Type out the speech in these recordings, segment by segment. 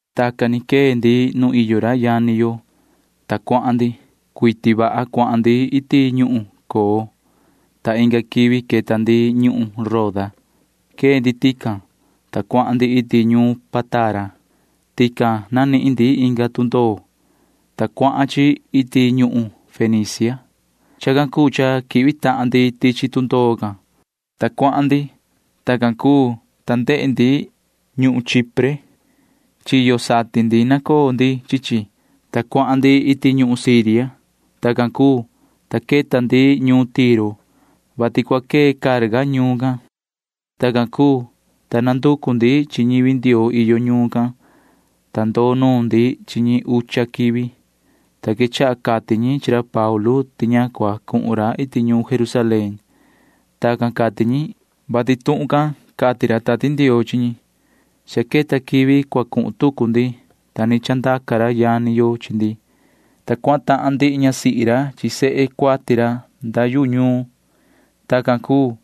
Tacan ni quee ndi nu iyo ra yani yo, ta cuahan ndi. Cuiti vaha cuahan ndi iti ñuhun Coo, ta inga quivi queta ndi ñuhun Roda. Quee ndi tican, ta cuahan ndi iti ñuun Pátara. Tican nanihin ndi inga tundoo, ta cuahan chi iti ñuhun Fenicia. Chacan cuu cha quihvi tahan ndi tichi tundoo can, ta cuahan ndi. Tacan cuu, ta ndehe ndi ñuhun Chipre. Chiyo satin ndi nacoo ndi chi chi, ta cuahan ndi iti ñuhun Siria. Tacan cuu, ta queta ndi ñuun Tiro, vati cua quee carga ñuun can. Tacan cuu, ta nanducu ndi chi ñivi Ndioo iyo ñuun can, ta ndoo nuun ndi chi ñi ucha quivi, ta quechaha cati ñi chi ra Paulu ti ña cua cuhun ra iti ñuun Jerusalén. Tacan cati ñi, vati tuhun can cati ra Tati Ndioo chi ñi. Cha queta quivi cua cuhun tucu ndi, ta ni chandaca ra yani yo chi ndi, ta cuahan tahan ndihi ñasihi ra chi sehe cuati ra nda yu ñuun. Tacan cuu,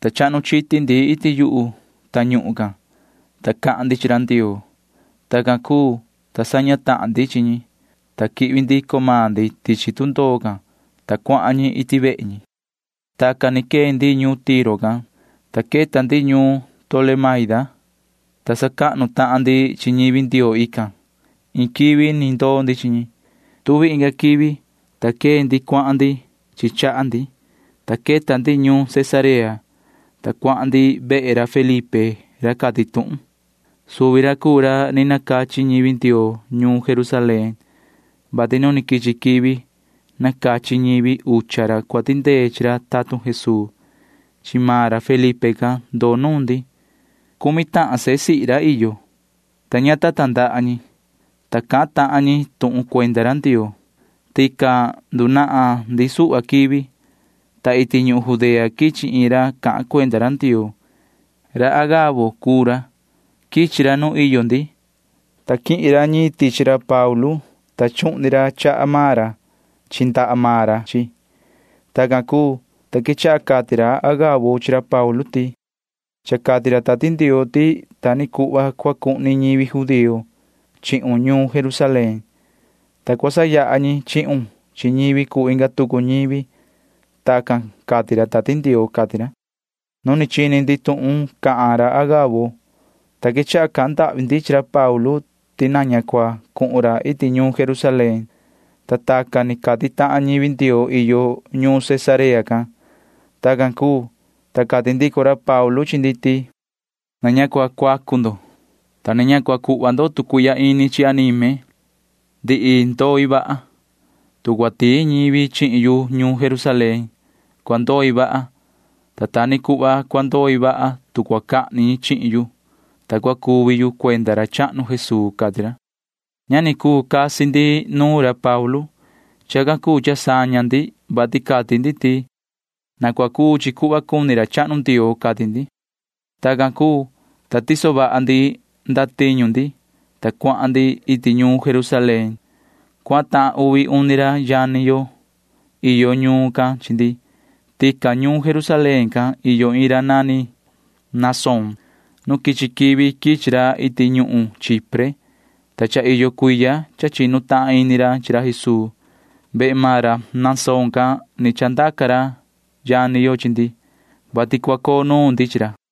ta chahnu chiti ndi iti yu tañuhun can, ta cahan ndi chi ra Ndioo. Tacan cuu, ta saña tahan ndi chi ñi, ta quihvi ndico maan ndi tichi tundoo can, ta cuahan ñi iti vehe ñi. Tacan ni quee ndi ñuun Tiro can, ta queta ndi ñuun Tolemaida, ta sacahnu tahan ndi chi ñivi Ndioo ican. Iin quivi ni ndoo ndi chi ñi. Tuvi inga quivi, ta quee ndi cuahan ndi chi chaha ndi, ta queta ndi ñuun Cesarea, ta cuahan ndi vehe ra Felipe ra cati tuhun. Suvi ra cuu ra ni nacachi ñivi Ndioo ñuun Jerusalén, vati nu quichi quivi nacachi ñivi ucha ra cua tindee chi ra tatun Jesuu. Chi maan ra Felipe can ndoo nuun ndi. Cumi tahan sehe sihi ra iyo, ta ña ta tandaha ñi, ta cahan tahan ñi tuhun cuenda ra Ndioo. Tican ndunahan ndi suhva quivi, ta iti ñuhun Judea quichi iin ra cahan cuenda ra Ndioo. Ra Agabo cuu ra. Quichi ra nu iyo ndi, ta quihin ra ñiin tichi ra Paulu, ta chuhni ra chaha maan ra chi ndaha maan ra chi chi. Tacan cuu, ta quechaha cati ra Agabo chi ra Paulu ti: ―Cha cati ra Tati Ndioo ti ta ni cuhva cua cuhni ñivi judío chihun ñuun Jerusalén, ta cua sayaha ñi chihun chi ñivi cuu inga tucu ñivi. Tacan cati ra Tati Ndioo ―cati ra. Nu ni chini ndi tuhun cahan ra Agabo, ta quechaha cahan ndahvi ndi chi ra Paulu ti na ña cua cuhun ra iti ñuun Jerusalén, ta tacan ni cati tahan ñivi Ndioo iyo ñuun Cesarea can. Tacan cuu, ta cati ndico ra Paulu chi ndi ti: ―Na ña cua cuacu ndo, ta na ña cua cuhva ndo tu cuihya ini chi anime. Ndihi ndoi vaha. Tu cua tiin ñivi chihin yu ñuun Jerusalén, cua ndoi vaha, ta ta ni cuhva cua ndoi vaha, tu cua cahni ñi chihin yu, ta cua cuvi yu cuenda ra chahnu Jesuu ―cati ra. Ña ni cuu casi ndi nuun ra Paulu. Chacan cuu cha saña ndi, vati cati ndi ti: ―Na cua cuu chi cuhva cuni ra chahnu Ndioo ―cati ndi. Tacan cuu, ta tiso vaha ndi ndatiñu ndi, ta cuahan ndi iti ñuun Jerusalén. Cuahan tahan uvi uni ra yani yo iyo ñuun can chi ndi. Tican ñuun Jerusalén can iyo iin ra nani Mnasón. Nu quichi quivi quichi ra iti ñuhun Chipre, ta cha iyo cuiya cha chinu tahan ini ra chi ra Jesuu. Vehe maan ra Mnasón can ni chandaca ra yani yo chi ndi, vati cua coo nuun ndi chi ra.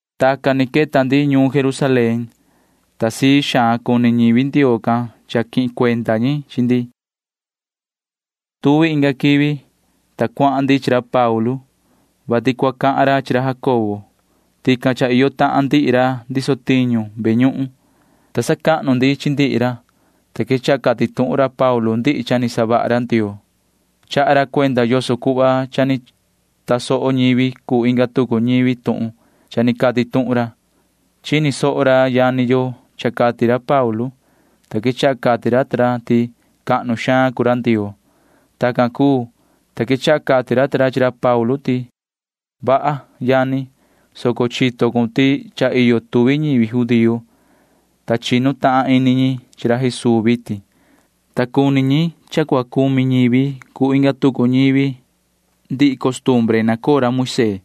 Tacan ni queta ndi ñuun Jerusalén, ta sii xaan cuni ñivi Ndioo can cha quihin cuenda ñi chi ndi. Tuvi inga quivi, ta cuahan ndi chi ra Paulu, vati cua cahan ra chi ra Jacobo. Tican cha iyo tahan ndihi ra ndiso tiñu ve ñuhun, ta sacahnu ndi chi ndihi ra, ta quechaha cati tuhun ra Paulu ndihi cha ni savaha ra Ndioo. Chaha ra cuenda yoso cuhva cha ni tasoho ñivi cuu inga tucu ñivi tuhun cha ni cati tuhun ra. Chini soho ra yani yo cha cati ra Paulu, ta quechaha cati ra ta ra ti cahnu xaan cuu ra Ndioo. Tacan cuu, ta quechaha cati ra ta ra chi ra Paulu ti: ―Vaha, yani, soco chito cun ti cha iyo tuvi ñivi judío, ta chinu tahan ini ñi chi ra Jesuu vitin, ta cuni ñi cha cua cumi ñivi cuu inga tucu ñivi ndihi costumbre nacoo ra Moisee.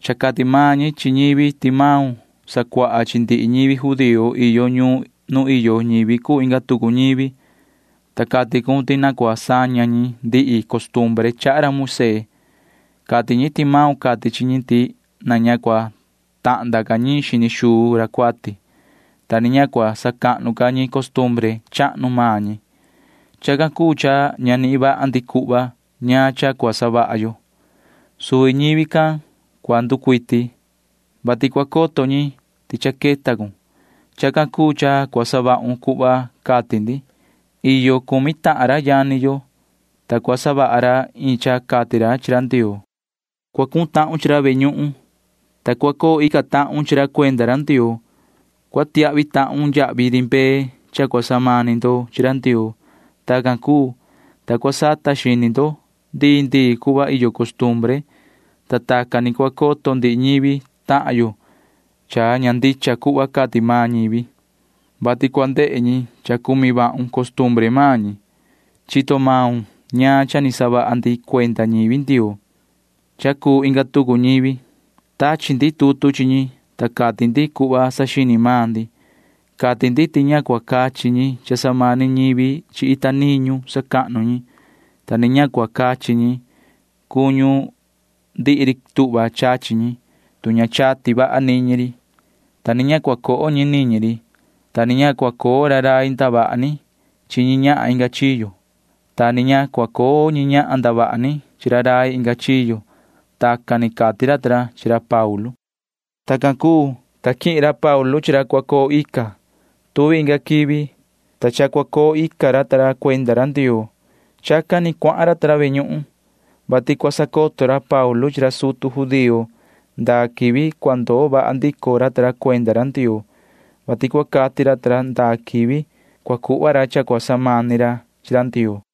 Cha cati maan ñi chi ñivi ti maun sacuaha chi ndihi ñivi judío iyo ñuun nu iyo ñivi cuu inga tucu ñivi, ta cati cun ti na cua saña ñi ndihi costumbre chaha ra Moisee. Cati ñi ti maun cati chi ñi ti na ña cua tahnda ca ñiin xini xuu ra cuati, ta ni ña cua sacahnu ca ñi costumbre chahnu maan ñi. Chacan cuu cha ña nihin vaha ndi cuhva ñaan cha cua savaha yo. Suvi ñivi can cua nducuiti, vati cua coto ñi ti cha queta cun. Chacan cuu cha cua savahun cuhva cati ndi. Iyo cumi tahan ra yani yo, ta cua savaha ra iin cha cati ra chi ra Ndioo. Cua cuhun tahun chi ra ve ñuhun, ta cua coo ica tahun chi ra cuenda ra Ndioo. Cua tiahvi tahun yahvi ri mbee cha cua samani ndo chi ra Ndioo. Tacan cuu, ta cua sata xini ndo ndii ndii cuhva iyo costumbre, ta tacan ni cua coto ndihi ñivi tahan yo cha ña ndicha cuhva cati maan ñivi, vati cua ndehe ñi cha cumi vahun costumbre maan ñi. Chito maun ñaan cha ni savaha ndi cuenda ñivi Ndioo cha cuu inga tucu ñivi. Tachi ndi tutu chi ñi, ta cati ndi cuhva saxini maan ndi. Cati ndi ti ña cua cachi ñi cha samani ñivi chi ita niñu sacahnu ñi, ta ni ña cua cachi ñi cuñu ndihi ri tuhva chachi ñi, tu ña chati vaha niñi ri, ta ni ña cua coho ñi niñi ri, ta ni ña cua coo ra rai ndavaha ni chi ñi ñahan inga chiyo, ta ni ña cua coo ñi ñahan ndavaha ni chi ra rai inga chiyo. Tacan ni cati ra ta ra chi ra Paulu. Tacan cuu, ta quihin ra Paulu chi ra cua coo ica. Tuvi inga quivi, ta cha cua coo ica ra ta ra cuenda ra Ndioo. Chacan ni cuahan ra ta ra ve ñuhun, vati cua sacoto ra Paulu chi ra sutu judío ndaa quivi cua ndoo vaha ndico ra ta ra cuenda ra Ndioo, vati cua cati ra ta ra ndaa quivi cua cuhva ra cha cua samani ra chi ra Ndioo.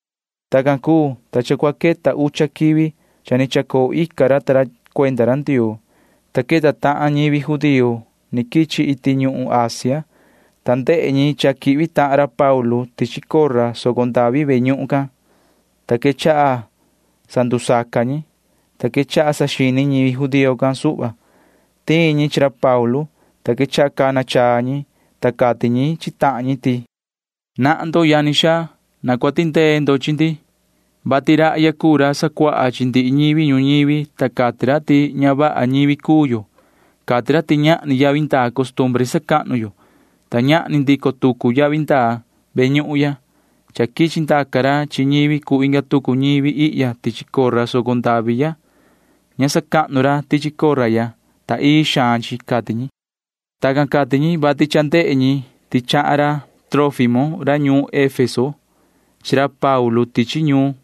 Tacan cuu, ta cha cua queta ucha quivi cha ni chacoo ica ra ta ra cuenda ra Ndioo, ta queta tahan ñivi judío ni quichi iti ñuhun Asia, ta ndehe ñi cha quihvi tahan ra Paulu tichi cora soco ndavi ve ñuhun cahnu can, ta quechaha sandusaca ñi, ta quechaha saxini ñivi judío can suhva. Tiin ñi chi ra Paulu, ta quechaha cana chaa ñi, ta cati ñi chi tahan ñi ti: ―Nahan ndo, yani xaa. Na cua tindee ndo chi ndi, vati rahya cuu ra sacuaha chi ndihi ñivi ñuñivi, ta cati ra ti ña vaha ñivi cuu yo. Cati ra ti ñahni yavi ndaa costumbre sacahnu yo, ta ñahni ndico tucu yavi ndaa ve ñuhun ya. Cha quichi ndaca ra chi ñivi cuu inga tucu ñivi ihya tichi cora soco ndavi ya. Ña sacahnu ra tichi cora ya, ta ii xaan chi ―cati ñi. Tacan cati ñi, vati cha ndehe ñi ti chahan ra Trófimo ra ñuun Efeso chi ra Paulu tichi ñuun,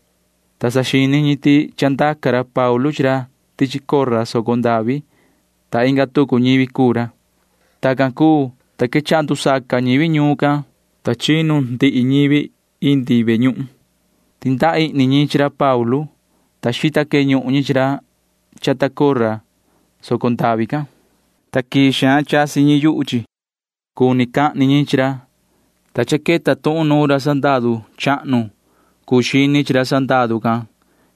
ta saxini ñi ti chandaca ra Paulu chi ra tichi cora soco ndavi, ta inga tucu ñivi cuu ra. Tacan cuu, ta quechaha ndusaca ñivi ñuun can, ta chinu ndihi ñivi iti ve ñuhun. Tindaha ihni ñi chi ra Paulu, ta xita queñuhun ñi chi ra chata cora soco ndavi can, ta quii xaan chasi ñi yuhu chi. Cuni cahni ñi chi ra, ta cha queta tuhun nuun ra sandaru chahnu cuu xini chi ra sandaru can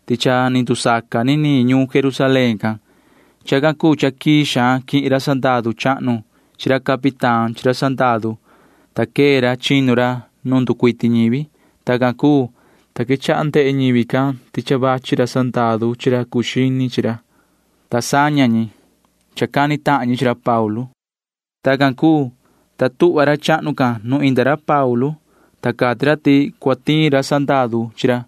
ti cha ni ndusaca niniin ñuun Jerusalén can. Chacan cuu cha quii xaan quihin ra sandaru chahnu chi ra capitán chi ra sandaru, ta quee ra chinu ra nu nducuiti ñivi. Tacan cuu, ta quechaha ndehe ñivi can ti cha vachi ra sandaru chi ra cuu xini ra, ta saña ñi cha cani ñi chi ra Paulu. Tacan cuu, ta tuhva ra chahnu can nu inda ra Paulu, ta cati ra ti cua tiin ra sandaru chi ra,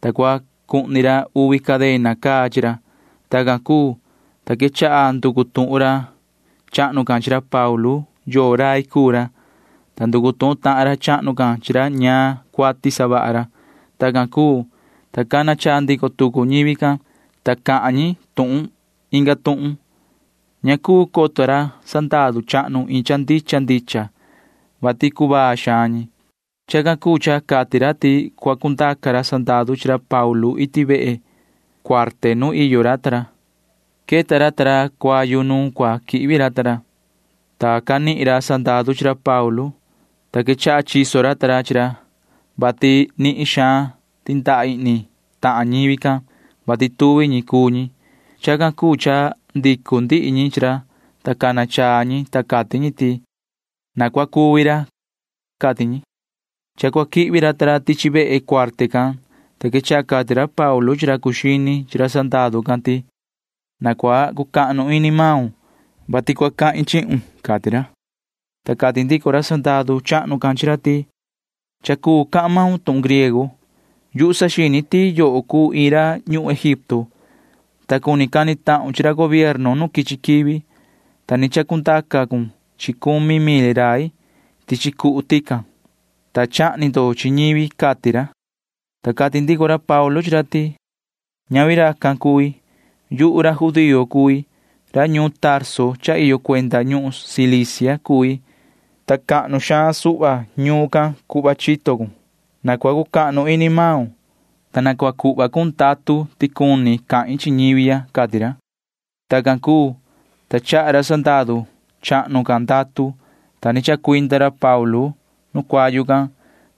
ta cua cuhni ra uvi cadena caa chi ra. Tacan cuu, ta quechaha nducu tuhun ra chahnu can chi ra Paulu yoo rai cuu ra, ta nducu tuhun tahan ra chahnu can chi ra ñaan cuati savaha ra. Tacan cuu, ta cana chaa ndico tucu ñivi can, ta cahan ñi iin tuhun inga tuhun. Ña cuu coto ra sandaru chahnu iin cha ndicha ndicha, vati cuvaa xaan ñi. Chacan cuu cha cati ra ti cua cundaca ra sandaru chi ra Paulu iti ve cuarte nu iyo ra ta ra. Queta ra ta ra cuayu nu cua quihvi ra ta ra, ta canihin ra sandaru chi ra Paulu, ta quechaha chiso ra ta ra chi ra, vati nihin xaan tindaha ihni tahan ñivi can, vati tuvi ñi cuu ñi. Chacan cuu cha ndicu ndihi ñi chi ra, ta cana chaa ñi, ta cati ñi ti: ―Na cua cuvi ra ―cati ñi. Cha cua quihvi ra ta ra tichi vehe cuarte can, ta quechaha cati ra Paulu chi ra cuu xini chi ra sandaru can ti: ―Na cua cucahnu ini maun, vati na cua cahin chihun ―cati ra. Ta cati ndico ra sandaru chahnu can chi ra ti: ―Cha cuu cahan maun tuhun griego. Yuhu saxini ti yoho cuu iin ra ñuhun Egipto, ta cuni cani tahun chi ra gobierno nu quichi quivi, ta ni chacundaca cun chi cumi mil rai tichi cuhu tican, ta chahni ndo chi ñivi ―cati ra. Ta cati ndico ra Paulu chi ra ti: ―Ñavi racan cui. Yuhu ra judío cui. Ra ñuun Tarso cha iyo cuenda ñuhun Cilicia cui, ta cahnu xaan suhva ñuun can cuhva chito cun. Na cua cucahnu ini maun, ta na cua cuhva cun ndatu ti cuni cahin chi ñivi ya ―cati ra. Tacan cuu, ta chaha ra sandaru chahnu can ndatu, ta ni chacuinda ra Paulu nu cuayu can,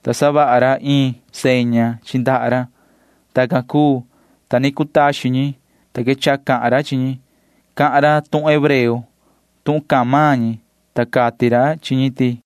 ta savaha ra iin seña chi ndaha ra. Tacan cuu, ta ni cutaxin ñi, ta quechaha cahan ra chi ñi. Cahan ra tuhun hebreo tuhun cahan maan ñi, ta cati ra chi ñi ti: